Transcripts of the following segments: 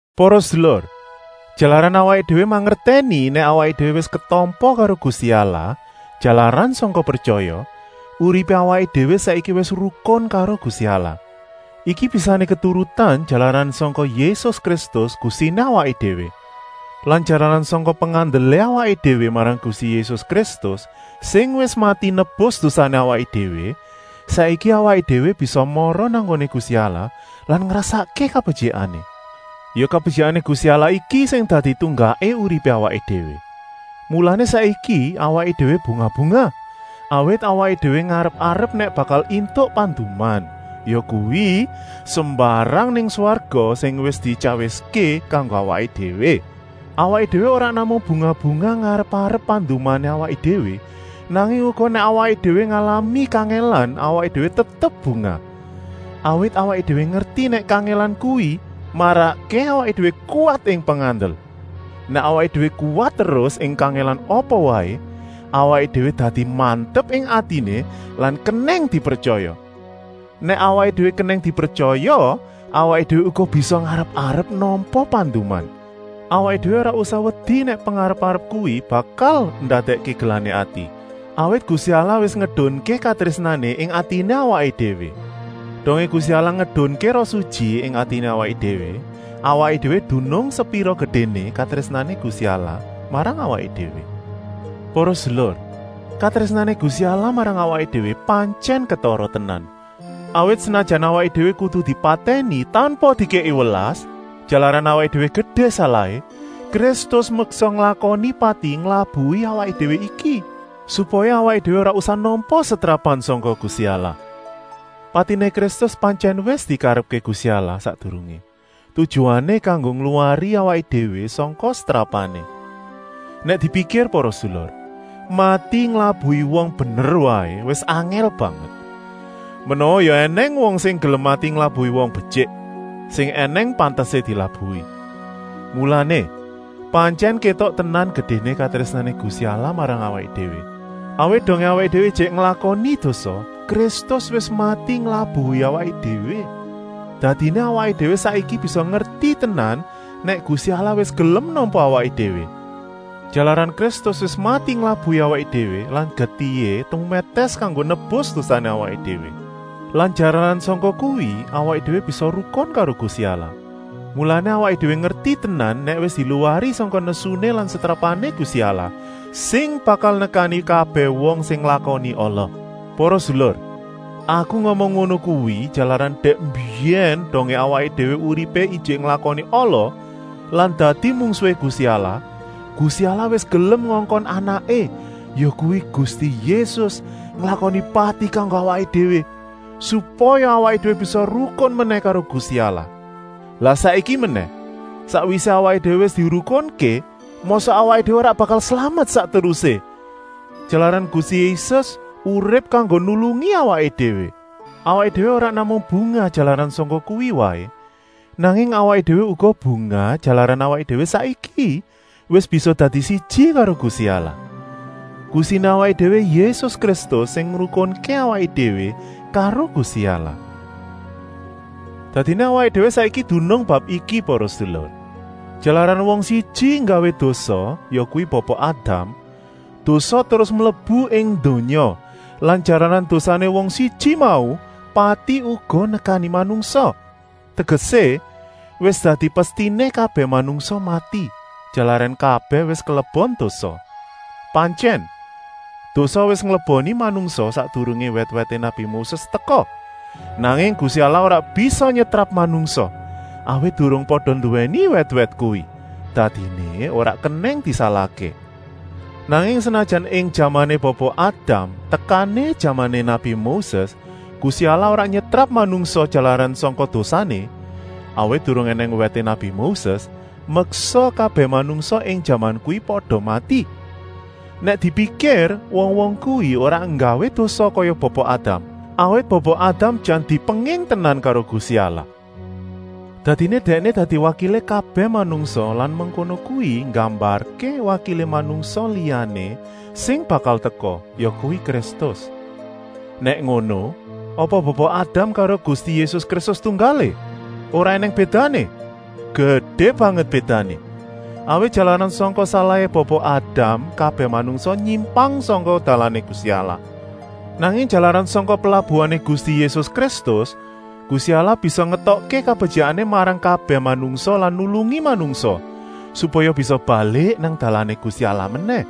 Para sedulur, jalaran awaké déwé mangertèni nèk awaké déwé wis ketampa karo Gusti Allah jalaran sangka pretyaya, uripé awaké déwé saiki wis rukun karo Gusti Allah. Iki bisané keturutan jalaran sangka Yésus Kristus, Gustiné awaké déwé. Lan jalaran sangka pengandelé awaké déwé marang Gusti Yésus Kristus sing wis mati nebus dosané awaké déwé, saiki awaké déwé bisa mara nang nggoné Gusti Allah lan ngrasakké kabetyikané. Ya kabetyikané Gusti Allah iki sing dadi tunggaké uripé awaké déwé. Mulané saiki awaké déwé bungah-bungah, awit awaké déwé ngarep-arep nèk bakal éntuk panduman, yakuwi, sembarang nang swarga sing wis dityawiské kanggo awaké déwé. Awaké déwé ora namung bungah-bungah ngarep-arep pandumané awaké déwé, nanging uga nèk awaké déwé ngalami kangèlan awaké déwé tetep bungah. Awit awaké déwé ngerti nèk kangèlan kuwi marakké awaké déwé kuwat ing pengandel. Nèk awaké déwé kuwat terus ing kangèlan apa waé, awaké déwé dadi mantep ing atiné lan kenèng dipretyaya. Nèk awaké déwé kenèng dipretyaya, awaké déwé uga bisa ngarep-arep nampa panduman. Awaké déwé ora usah wedi nèk pengarep-arep kuwi bakal ndadèkké gelané ati, awit Gusti Allah wis ngedunké katrésnané ing atiné awaké déwé. Dongé Gusti Allah ngedunké Roh Sutyi ing atiné awaké déwé, awaké déwé dunung sepira gedéné katrésnané Gusti Allah marang awaké déwé. Para sedulur, katrésnané Gusti Allah marang awaké déwé pantyèn ketara tenan, awit senajan awaké déwé kudu dipatèni tanpa dikèki welas, jalaran awaké déwé gedé salahé, Kristus meksa nglakoni pati nglabuhi awaké déwé iki, supaya awaké déwé ora usah nampa setrapan sangka Gusti Allah. Patiné Kristus pantyèn wis dikarepké Gusti Allah sakdurungé, tujuané kanggo ngluwari awaké déwé sangka setrapané. Nèk dipikir para sedulur, mati nglabuhi wong bener waé wis angèl banget. Menawa ya ènèng wong sing gelem mati nglabuhi wong betyik, sing ènèng pantesé dilabuhi. Mulané, pantyèn kétok tenan gedéné katrésnané Gusti Allah marang awaké déwé, awit dongé awaké déwé ijik nglakoni dosa, Kristus wis mati nglabuhi awaké déwé. Dadiné awaké déwé saiki bisa ngerti tenan nèk Gusti Allah wis gelem nampa awaké déwé, jalaran Kristus wis mati nglabuhi awaké déwé lan getihé tumètès kanggo nebus dosané awaké déwé. Lan jalaran sangka kuwi awaké déwé bisa rukun karo Gusti Allah, mulané awaké déwé ngerti tenan nèk wis diluwari sangka nesuné lan setrapané Gusti Allah, sing bakal nekani kabèh wong sing nglakoni ala. Para sedulur, aku ngomong ngono kuwi, jalaran dèk mbiyèn waé dongé awaké déwé uripé ijik nglakoni ala lan dadi mungsuhé Gusti Allah, Gusti Allah wis gelem ngongkon Anaké, yakuwi Gusti Yésus, nglakoni pati kanggo awaké déwé, supaya awaké déwé bisa rukun menèh karo Gusti Allah. Lah saiki menèh, sakwisé awaké déwé wis dirukunké, mosok awaké déwé ora bakal slamet sak terusé, jalaran Gusti Yésus urip kanggo nulungi awaké déwé. Para sedulur, awaké déwé ora namung bungah jalaran sangka kuwi waé, nanging awaké déwé uga bungah jalaran awaké déwé saiki wis bisa dadi siji karo Gusti Allah. Gustiné awaké déwé Yésus Kristus sing ngrukunké awaké déwé karo Gusti Allah. Dadiné awaké déwé saiki dunung bab iki para sedulur: jalaran wong siji nggawé dosa, yakuwi Bapa Adam, dosa terus mlebu ing donya lan jalaran dosané wong siji mau, pati uga nekani manungsa. Tegesé, wis dadi pestiné kabèh manungsa mati, jalaran kabèh wis kelebon dosa. Pantyèn, dosa wis ngleboni manungsa sakdurungé wèt-wèté nabi Moses teka, nanging Gusti Allah ora bisa nyetrap manungsa, awit durung pada nduwèni wèt-wèt kuwi, dadiné ora kenèng disalahké. Nanging senajan ing jamané Bapa Adam tekané jamané nabi Moses Gusti Allah ora nyetrap manungsa jalaran sangka dosané, awit durung ènèng wèté nabi Moses, meksa kabèh manungsa ing jaman kuwi pada mati. Nèk dipikir wong-wong kuwi ora nggawé dosa kaya Bapa Adam, awit Bapa Adam jan dipenging tenan karo Gusti Allah. Dadiné dèkné dadi wakilé kabèh manungsa lan mengkono kuwi nggambarké wakilé manungsa liyané sing bakal teka, yakuwi Kristus. Nèk ngono, apa Bapa Adam karo Gusti Yésus Kristus tunggalé, ora ènèng bédané? Gedé banget bédané? Awit jalaran sangka salahé Bapa Adam kabèh manungsa nyimpang sangka dalané Gusti Allah. Nanging jalaran sangka pelabuhané Gusti Yésus Kristus, Gusti Allah bisa ngétokké kabetyikané marang kabèh manungsa lan nulungi manungsa, supaya bisa balik nang dalané Gusti Allah menèh.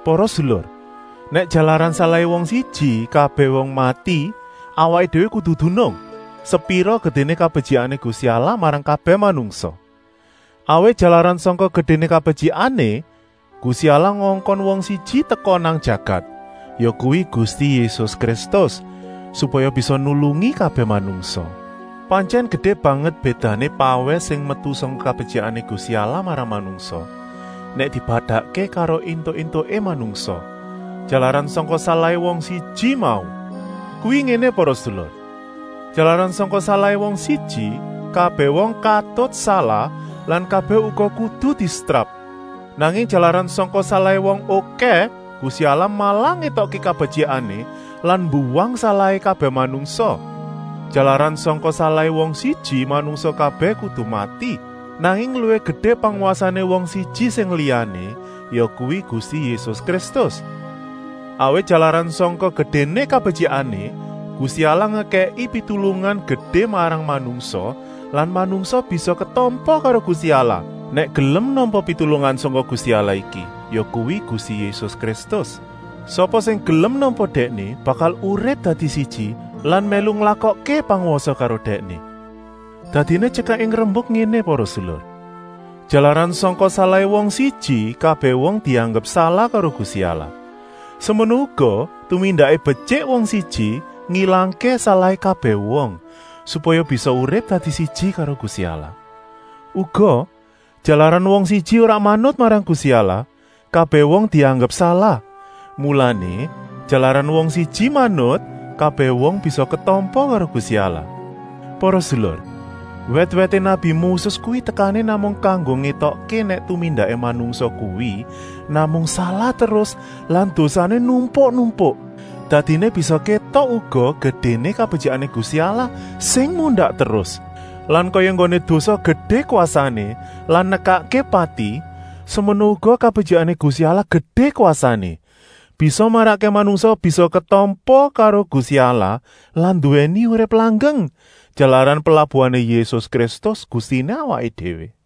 Para sedulur, nèk jalaran salahé wong siji kabèh wong mati, awaké déwé kudu dunung, sepira gedéné kabetyikané Gusti Allah marang kabèh manungsa. Awit jalaran sangka gedéné kabetyikané, Gusti Allah ngongkon wong siji teka nang jagat, yakuwi Gusti Yésus Kristus, supaya bisa nulungi kabèh manungsa. Pantyèn gedé banget bédané pawèh sing metu sangka kabetyikané Gusti Allah marang manungsa, nèk dipadakké karo éntuk-éntuké manungsa, jalaran sangka salahé wong siji mau. Kuwi ngéné para sedulur! Jalaran sangka salahé wong siji, kabèh wong katut salah lan kabèh uga kudu disetrap. Nanging jalaran sangka salahé wong okèh, Gusti Allah malah ngétokké kabetyikané lan mbuwang salahé kabèh manungsa. Jalaran sangka salahé wong siji manungsa kabèh kudu mati. Nanging luwih gedé pangwasané wong siji sing liyané, yakuwi Gusti Yésus Kristus. Awit jalaran sangka gedéné kabetyikané, Gusti Allah ngekèki pitulungan gedé marang manungsa lan manungsa bisa ketampa karo Gusti Allah, nèk gelem nampa pitulungan sangka Gusti Allah iki, yakuwi Gusti Yésus Kristus. Sapa sing gelem nampa Dèkné bakal urip dadi siji lan mèlu nglakokké pangwasa karo Dèkné. Dadiné tyekaké rembuk ngéné para sedulur: jalaran sangka salahé wong siji kabèh wong dianggep salah karo Gusti Allah, semono uga tumindaké betyik wong siji ngilangké salahé kabèh wong, supaya bisa urip dadi siji karo Gusti Allah. Uga, jalaran wong siji ora manut marang Gusti Allah, kabèh wong dianggep salah, mulané, jalaran wong siji manut, kabèh wong bisa ketampa karo Gusti Allah. Para sedulur, wèt-wèté nabi Moses kuwi tekané namung kanggo ngétokké nèk tumindaké manungsa kuwi namung salah terus lan dosané numpuk-numpuk. Dadiné bisa kétok uga gedéné kabetyikané Gusti Allah, sing mundak terus. Lan kaya enggoné dosa gedé kwasané lan nekakké pati, semono uga kabetyikané Gusti Allah gedé kwasané, bisa marakké manungsa bisa ketampa karo Gusti Allah lan nduwèni urip langgeng, jalaran pelabuhané Yésus Kristus, Gustiné awaké déwé.